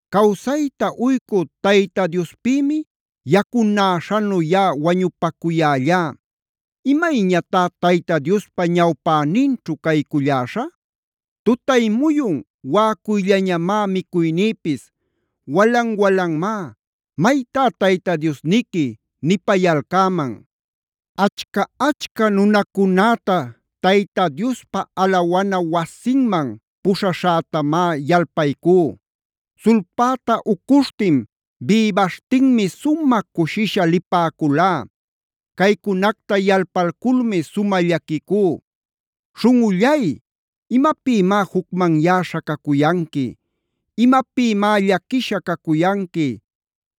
Cawsayta uycü Tayta Diospïmi yacunäśhanu yaꞌa wañupacuyällá.a ¿Imayñatá Tayta Diospa ñawpäninćhu cayculläśhä? Tutay muyun waꞌacuyllañamá micuynïpis. Walan-walanmá: “¿Maytá Tayta Diosniqui?” nipayalcäman. Achca-achca nunacunäta Tayta Diospa alawana wasinman puśhaśhätamá yalpaycú. Sulpäta ucuśhtin, bïbaśhtinmi sumä cushisha lipäculá. Caycunacta yalpalculmi sumä llaquicú. Śhunꞌullay, ¿imapïmá jucmanyäśha cacuyanqui? ¿Imapïmá llaquisha cacuyanqui?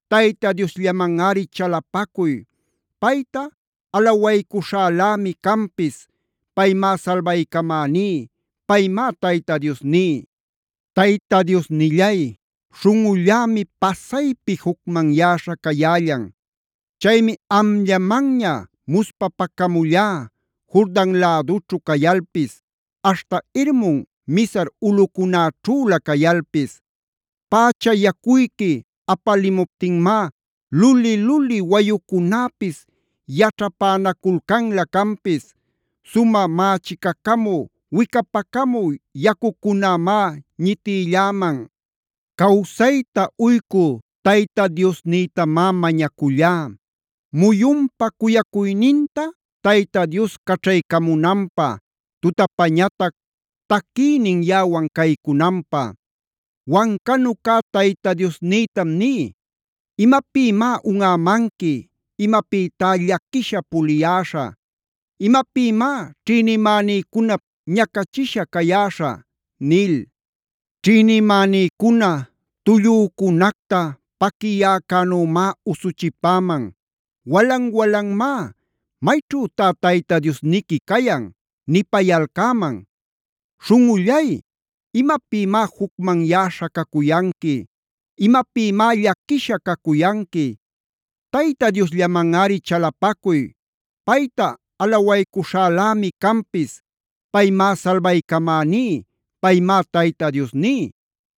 Tayta Diosllamanꞌari chalapacuy. Payta alawaycuśhälämi canpis; paymá salbaycamäní; paymá Tayta Diosní. Tayta Diosnillay, śhunꞌullämi pasaypi jucmanyäśha cayällan. Chaymi amllamanña muspapacamullá Jordan lädućhu cayalpis, aśhta Hermon Mizar ulꞌucunäćhülä cayalpis. Pächa yacuyqui apaliptinmá luli-luli wayucunäpis yaćhapänaculcanlä canpis.b Sumä mächicacamü wicapacamü yacucunämá ñitïlläman. Cawsayta uycü Tayta Diosnïtamá mañacullá, muyunpa cuyacuyninta Tayta Dios caćhaycamunanpä, tutapañatac taquiynin yaꞌawan caycunanpä. Wancanu cä Tayta Diosnïtam ní: “¿Imapïmá unꞌämanqui? ¿Imapïtá llaquisha puliyäśhä? ¿Imapïmá ćhïnimänïcunap ñacachishan cayäśhä?” nil. Ćhïnimänïcuna tullücunacta paquiyäcänümá usuchipäman; walan-walanmá: “¿Mayćhütá Tayta Diosniqui cayan?” nipayalcäman. Śhunꞌullay, ¿imapïmá jucmanyäśha cacuyanqui? ¿Imapïmá llaquisha cacuyanqui? Tayta Diosllamanꞌari chalapacuy. Payta alawaycuśhälämi canpis. Paymá salbaycamäní. Paymá Tayta Diosní.